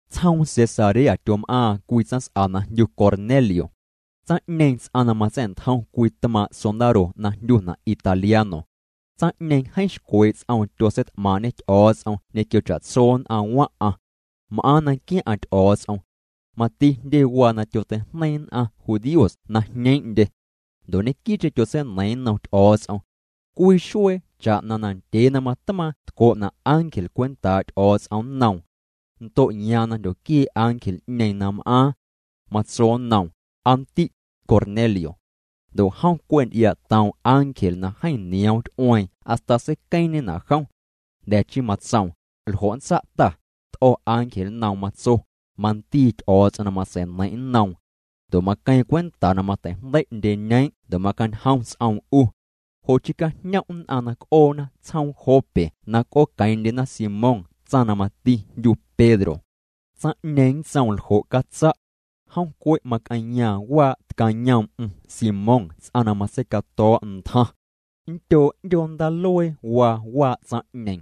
Tsjoom Cesarea tyom'aaⁿ cwii tsaⁿs'a na jndyu Cornelio. Tsaⁿ'ñeeⁿ ts'aⁿ na matsa̱'ntjom cwii tmaaⁿ' sondaro na jndyuna' Italiano. Tsaⁿ'ñeeⁿ jeeⁿ xcwee' ts'oom tyotseit'maaⁿ'ñê Ty'o̱o̱ts'om ñequio cha'tso nn'aⁿ waⁿ'aⁿ. M'aaⁿ na nquiaⁿ'aⁿ Ty'o̱o̱ts'om. Mati jndye waa na tyoteijneiⁿ nn'aⁿ judíos na jñeeⁿ'ndye. Ndo' ñequii'cheⁿ tyotseineiiⁿ nnom Ty'o̱o̱ts'om. Cwii xuee cha'na na ndyee na matmaaⁿ tco'na' ángel cwentaa' Ty'o̱o̱ts'om nnoom. Ndo'yaaⁿ na jndyoquiee' ángel'ñeeⁿ na m'aaⁿ. Matso nnoom: —Aa ndi', Cornelio. Ndo' jom cwe' nty'iaa'toom ángel na jeeⁿ nioom ty'ueeⁿ hasta seiqueeⁿñena' jom. Jnda̱ chii matsoom: —¿Ljo' nntsa' Ta? T'o̱ ángel nnoom matso: —Mandii Ty'o̱o̱ts'om na matsei'neiⁿ' nnoom. Ndo' maqueeⁿ cwenta na mateijndei' ndyeñeeⁿ' ndo' macañjom ts'oom 'u. Jo'chii cajñom' nn'aⁿ na c'oona tsjoom Jope na c'ooqueeⁿ'ndyena Simón tsaⁿ na mati jndyu Pedro. Tsaⁿ'ñeeⁿ nntsoom ljo' catsa'. Jom cwe' mac'eⁿyaaⁿ waa' tcayoom'm Simón ts'aⁿ na matseicato̱o̱' ntjaⁿ. Nndyoo' 'ndyoo ndaaluee waa waa' tsaⁿ'ñeeⁿ.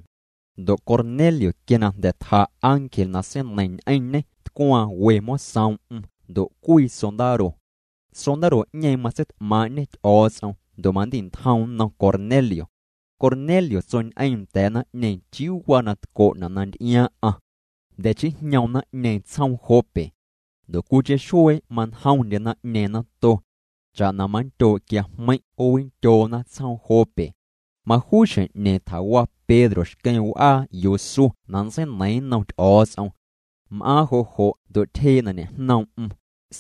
Ndo' Cornelio quia na jnda̱ tja ángel na seineiⁿ ñ'eⁿñê tcwaaⁿ we mosoom'm ndo' cwii sondaro. Sondaro'ñeeⁿ matseit'maaⁿ'ñê Ty'o̱o̱ts'om ndo' mandi'ntjoom nnom Cornelio. Cornelio tsoñ'eeⁿ nda̱a̱ naⁿ'ñeeⁿ chiuu waa na tco'na na nty'iaaⁿ'aⁿ. Jnda̱ chii jñoom naⁿ'ñeeⁿ tsjoom Jope. Ndo' cwiicheⁿ xuee manjomndye naⁿ'ñeeⁿ nato. Cha'na manndyoo' quiajmeiⁿ' 'oowindyoona tsjoom Jope. Majuu xjeⁿ'ñeeⁿ tjawa Pedro xqueⁿ w'aa yuu su na nntseineiiⁿ nnom Ty'o̱o̱ts'om. M'aaⁿ jo' jo' ndo' tyjee' na ñe'jnoom'm,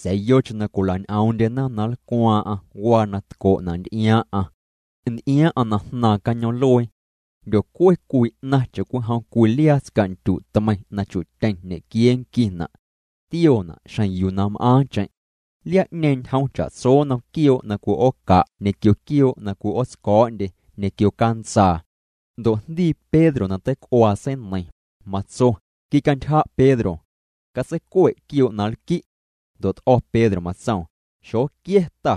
sa̱a̱ yocheⁿ na cwila'ñ'oom'ndyena na nlcwaaⁿ'aⁿ waa na tco'na' nty'iaaⁿ'aⁿ. Nty'iaaⁿ'aⁿ na jnaaⁿ cañoom'luee. Jndyocue cwii 'naⁿ cha'cwijom cwii liaa tsca'ndyu' tmeiⁿ na chu'tyeⁿ ñequiee nquina'. Tioona' xjeⁿ yuu na m'aaⁿcheⁿ. Liaa'ñeeⁿ ñjom cha'tso nnom quioo' na cwi'ooca' ñequio quioo' na cwi'ootsco̱o̱'ndye ñequio cantsaa. Ndo' jndii Pedro na teic'uaa, seineiⁿ, matso: —Quicantyja' Pedro. Catseicue' quioo' na nlqui'. Ndo' t'o̱ Pedro, matsoom: —Xoquia̱ Ta.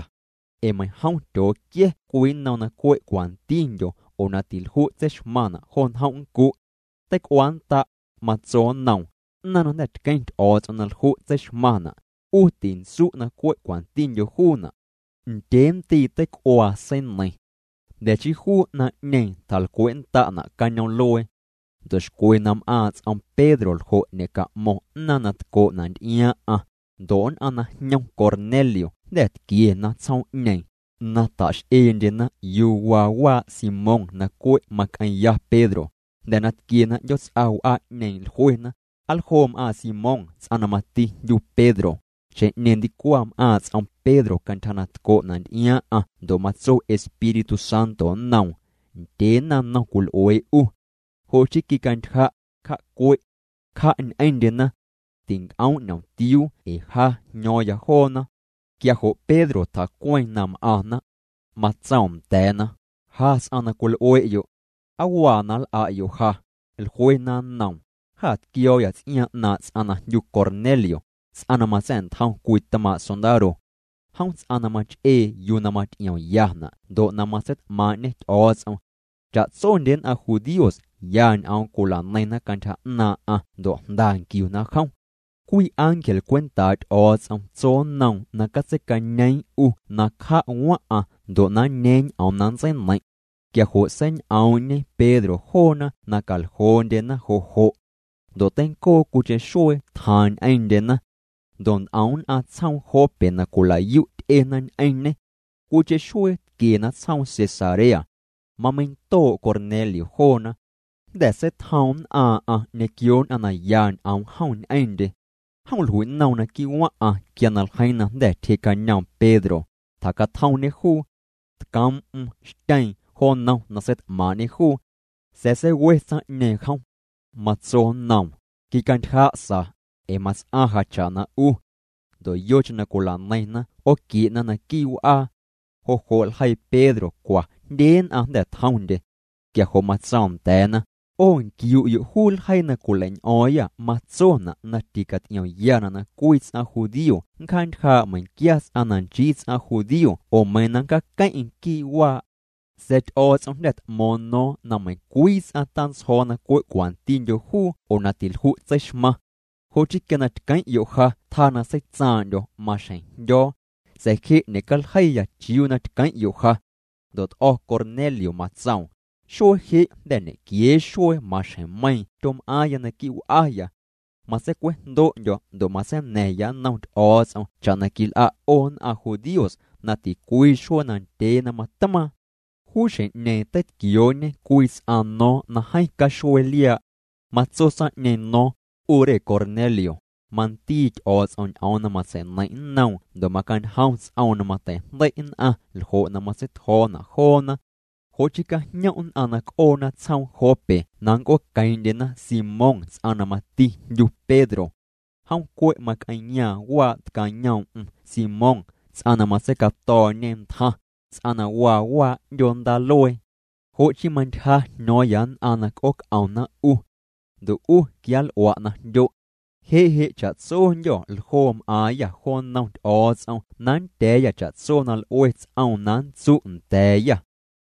Ee meiⁿjom tyooquia̱ cwii nnom na cwe' cwantindyo oo na tilju' tseixmaⁿna' jo njom' nncu'. Teic'uaannda', matso nnoom: —'Naⁿ na jnda̱ tqueⁿ Ty'o̱o̱ts'om na lju' tseixmaⁿna', 'u tintsu' na cwe' na cwantindyo juuna'. Ndyee ndii' teic'uaa seineiⁿ. Jnda̱ chii juu 'naⁿ'ñeeⁿ tjalcwe'nnda'na' cañoom'luee. Ndo' xcwe na m'aaⁿ' ts'om Pedro ljo' ñe'ca'mo̱ⁿ 'naaⁿ na tco'na' nty'iaaⁿ'aⁿ, ndo' nn'aⁿ na jñom Cornelio jnda̱ tquiena tsjoom'ñeeⁿ, na tax'eendyena yuu waa waa' Simón na cwe' mac'eⁿya Pedro. Jnda̱ na tquiena 'ndyoots'a w'aa'ñeeⁿ, jluena: —¿Aa ljoo m'aaⁿ Simón ts'aⁿ na mati jndyu Pedro? Xjeⁿ'ñeeⁿ ndicwaⁿ m'aaⁿ' ts'om Pedro cantyja na tco'na' nty'iaaⁿ'aⁿ ndo' matso Espíritu Santo nnoom: —Ndyee naⁿnom cwil'uee 'u. Jo' chii quicantyja', cja'cue'. Cja' ñ'eⁿndyena. Tinc'oom' ñomtiuu' ee ja jño̱o̱ⁿya joona. Quia jo' Pedro tjacueeⁿ na m'aⁿna. Matsoom nda̱a̱na: —Ja ts'aⁿ na cwil'ue'yo'. ¿Aa waa na nl'a'yo' ja? Jluena nnoom: —Jâ tquio̱o̱yâ ts'iaaⁿ 'naaⁿ' ts'aⁿ na jndyu Cornelio, ts'aⁿ na matsa̱'ntjom cwii tmaaⁿ' sondaro. Jom ts'aⁿ na mach'ee yuu na maty'iomyana' ndo' na matseit'maaⁿ'ñê Ty'o̱o̱ts'om. Cha'tsondye nn'aⁿ judíos ya ñ'oom cwilaneiⁿna cantyja 'naaⁿ'aⁿ ndo' jnda nquiuna jom. Cwii ángel cwentaa' Ty'o̱o̱ts'om tso nnoom na catseicañeeⁿ 'u na cja' waⁿ'aⁿ ndo' na nñeeⁿ ñ'oom na nntseineiⁿ'. Quia jo' seiñ'oom'ñe Pedro joona na caljoo'ndyena jo' jo'. Ndo' teincoo cwiicheⁿ xuee tjaaⁿ ñ'eⁿndyena. Ndo' nt'om nn'aⁿ tsjoom Jope na cwilayu' ty'ena ñ'eⁿñê. Cwiicheⁿ xuee tquiena tsjoom Cesarea. Mameindoo' Cornelio joona. Jnda̱ seitjoom nn'aaⁿ'aⁿ ñequio nn'aⁿ na ya ñ'oom jom ñ'eⁿndye. Jom jlui'noom naquii' waⁿ'aⁿ quia na ljeiiⁿ na jnda̱ tyjee'cañoom Pedro, tjacatjomñê juu. Tcoom'm xtyeeⁿ jo nnom na seit'maaⁿ'ñê juu. Sa̱a̱ seiwe tsaⁿ'ñeeⁿ jom. Matso nnoom: —Quicantyja' sa, ee mats'aⁿ ja cha'na 'u. Ndo' yocheⁿ na cwila'neiⁿna 'ooquie'na naquii' w'aa. Jo' jo' ljeii Pedro cwa jndye nn'aⁿ jnda̱ tjomndye. Quia jo' matsoom nda̱a̱na: —'O nquiu'yo' juu ljeii na cwileiñ'o̱o̱ⁿyâ matsona' na ticaty'iomyana' na cwii ts'aⁿ judío nncjaantyjaa' meiⁿnquia ts'aⁿ na nchii ts'aⁿ judío oo meiⁿ na nncjaaqueⁿ'eⁿ quii' waa'. Sa̱a̱ Ty'o̱o̱ts'om jnda̱ t'mo̱o̱ⁿ no̱o̱ⁿ na meiⁿcwii ts'aⁿ tantsjo̱o̱ na cwe' cwantindyo juu oo na tilju' tseixmaⁿ. Jo' chii quia na tqueⁿ'yo' ja tjaa na seitsaaⁿ'ndyo̱, maxjeⁿ jndyo̱o̱. Sa̱a̱ je' ñecaljeiya chiuu na tqueⁿ'yo' ja. Ndo' t'o̱ Cornelio matsoom: —Xuee je' jnda̱ ñequiee xuee maxjeⁿmeiiⁿ tyom'aaⁿya naquii' w'aya. Matseicwejndo'ndyo̱ ndo' matseina̱ⁿya nnom Ty'o̱o̱ts'om cha'na quil'a' 'o nn'aⁿ judíos na ticwii xuee na ndyee na matmaaⁿ. Juu xjeⁿ'ñeeⁿ teitquioo'ñe cwii ts'aⁿ no̱o̱ⁿ na jeeⁿ caxuee liaa'. Matso tsaⁿ'ñeeⁿ no̱o̱ⁿ: “'U re Cornelio, mandii Ty'o̱o̱ts'om ñ'oom na matsei'neiⁿ' nnoom ndo' macañjom ts'oom na mateijndei' nn'aⁿ ljo' na matseitjo̱o̱na' joona. Jo' chii cajñom' nn'aⁿ na c'oona tsjoom Jope na nnc'ooqueeⁿ'ndyena Simón ts'aⁿ na mati jndyu Pedro. Jom cwe' mac'eⁿyaaⁿ waa' tcayoom'm Simón ts'aⁿ na matseicato̱o̱'ñe ntjaⁿ, ts'aⁿ na waa waa' 'ndyoo ndaaluee.” Jo' chii mantyja jño̱o̱ⁿ nn'aⁿ na c'ooc'omna 'u. Ndo' 'u quianl'ua' na jndyo'. Je' je' cha'tsondyô̱ ljoo m'aaⁿyâ jo nnom Ty'o̱o̱ts'om na nndya̱a̱yâ cha'tso na l'ue ts'oom na nntsu' nda̱a̱yâ.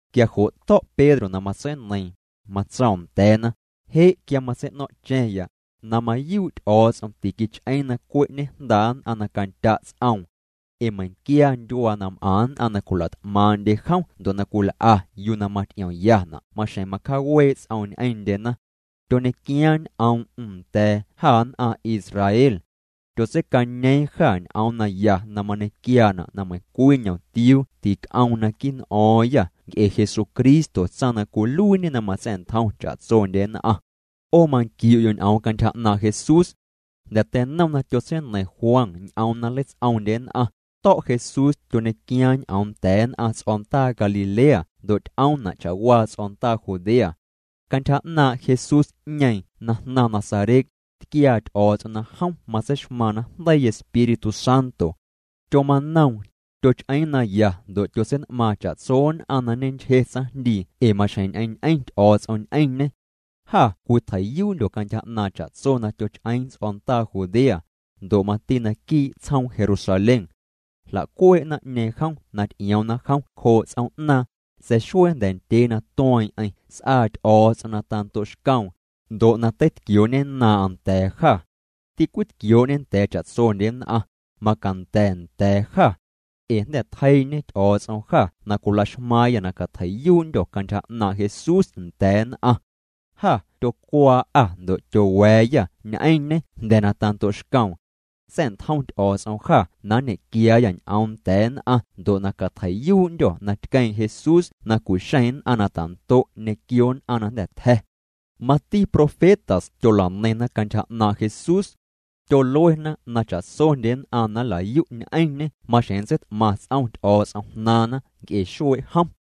Quia jo' to̱' Pedro na matseineiiⁿ, matsoom nda̱a̱na: —Je' quia matsei'no̱ⁿ'cha̱ⁿya, na mayuu' Ty'o̱o̱ts'om tiquich'eeⁿ na cwe' ñejndaa' nn'aⁿ na candya' ts'oom. Ee meiⁿquia ndyuaa na m'aⁿ nn'aⁿ na cwila't'maaⁿ'ndye jom ndo' na cwil'a yuu na maty'iomyana' maxjeⁿ macjaawee' ts'oom ñ'eⁿndyena. Tyoñequiaaⁿ ñ'oom'm nda̱a̱ jâ nn'aⁿ Israel. Tyotseicañeeⁿ jâ ñ'oom naya na mañequiaana' na meiⁿcwii ñ'omtiuu tic'oom naquii' n'o̱o̱ⁿyâ nc'e Jesucristo tsaⁿ na cwiluiiñe na matsa̱'ntjom cha'tsondye nn'aⁿ. 'O manquiu'yo' ñ'oom cantyja 'naaⁿ' Jesús. Jnda̱ teinom na tyotseineiⁿ Juan ñ'oom na nleits'oomndye nn'aⁿ, to̱' Jesús tyoñequiaaⁿ ñ'oom nda̱a̱ nn'aⁿ ts'o̱ndaa Galilea ndo' t'oom'na' cha'waa ts'o̱ndaa Judea. Cantyja 'naaⁿ' Jesús'ñeeⁿ na jnaⁿ Nazaret, tquiaa Ty'o̱o̱ts'om na jom matseixmaaⁿ najndeii Espíritu Santo. Tyomanoom, tyoch'eeⁿ naya ndo' tyotsein'maaⁿ cha'tso nn'aⁿ na ñenchje tsaⁿjndii ee maxjeⁿ ñ'eⁿñ'eⁿ Ty'o̱o̱ts'om ñ'eⁿñê. Jâ cwitjei'yuundyô̱ cantyja 'naaⁿ cha'tso na tyoch'eeⁿ ts'o̱ndaa Judea, ndo' mati naquii' tsjoom Jerusalén. Jla'cuee' naⁿ'ñeeⁿ jom na ty'ioomna jom cjoo' ts'oom'naaⁿ, sa̱a̱ xuee jnda̱ ndyee na tueeⁿ'eⁿ s'aa Ty'o̱o̱ts'om na tando'xcoom, ndo' na teitquioo'ñennaaⁿ'aⁿ nda̱a̱ jâ. Ticwitquioo'ñê nda̱a̱ cha'tsondye nn'aⁿ, macanda̱ nda̱a̱ jâ. Ee jnda̱ tjeii'ñe Ty'o̱o̱ts'om jâ na cwilaxmaaⁿyâ na catjei'yuu'ndyô̱ cantyja 'naaⁿ' Jesús nda̱a̱ nn'aⁿ. Jâ tyocwaa'â ndo' tyowa̱a̱yâ ñ'eⁿñê jnda̱ na tando'xcoom. Sa̱'ntjom Ty'o̱o̱ts'om jâ na nñequiaayâ ñ'oom nda̱a̱ nn'aⁿ ndo' na catjei'yuu'ndyô̱ na tqueeⁿ Jesús na cu'xeⁿ nn'aⁿ na ta'ndo' ñequio nn'aⁿ na jnda̱ tja̱. Mati profetas tyola'neiⁿna cantyja 'naaⁿ' Jesús. Tyoluena na cha'tsondye nn'aⁿ na nlayu' ñ'eⁿñê maxjeⁿ nntseit'maⁿ ts'om Ty'o̱o̱ts'om jnaaⁿna nc'e xuee' jom.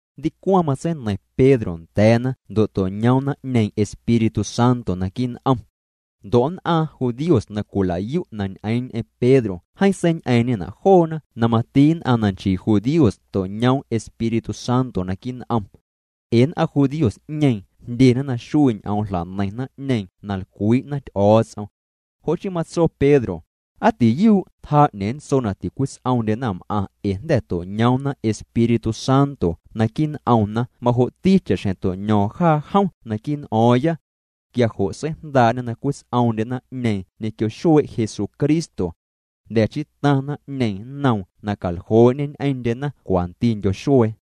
Ndicwaⁿ matseineiⁿ Pedro nda̱a̱na ndo' to'ñoom naⁿ'ñeeⁿ Espíritu Santo naquii' n'om. Ndo' nn'aⁿ judíos na cwilayu' na ñ'eeⁿ ñ'eⁿ Pedro jeeⁿ seiñ'eeⁿ'ñena' joona na mati nn'aⁿ na nchii judíos to'ñoomna Espíritu Santo naquii' n'om. Ee nn'aⁿ judíos'ñeeⁿ jndyena na xuii' ñ'oom jla'neiⁿ naⁿ'ñeeⁿ na lcwii'na Ty'o̱o̱ts'om. Jo' chii matso Pedro: —Aa tiyuu' tjaa 'ñeeⁿ nntso na ticwits'oomndye naⁿm'aⁿ ee jnda̱ to'ñoomna Espíritu Santo naquii' n'omna majo'ti cha'xjeⁿ to'ño̱o̱ⁿ jaa jom naquii' n'o̱o̱ⁿya. Quia jo' seijndaa'ñê na cwits'oomndye naⁿ'ñeeⁿ ñequio xuee' Jesucristo. Jnda̱ chii taⁿ naⁿ'ñeeⁿ nnoom na caljoo'ñê ñ'eⁿndyena cwantindyo xuee.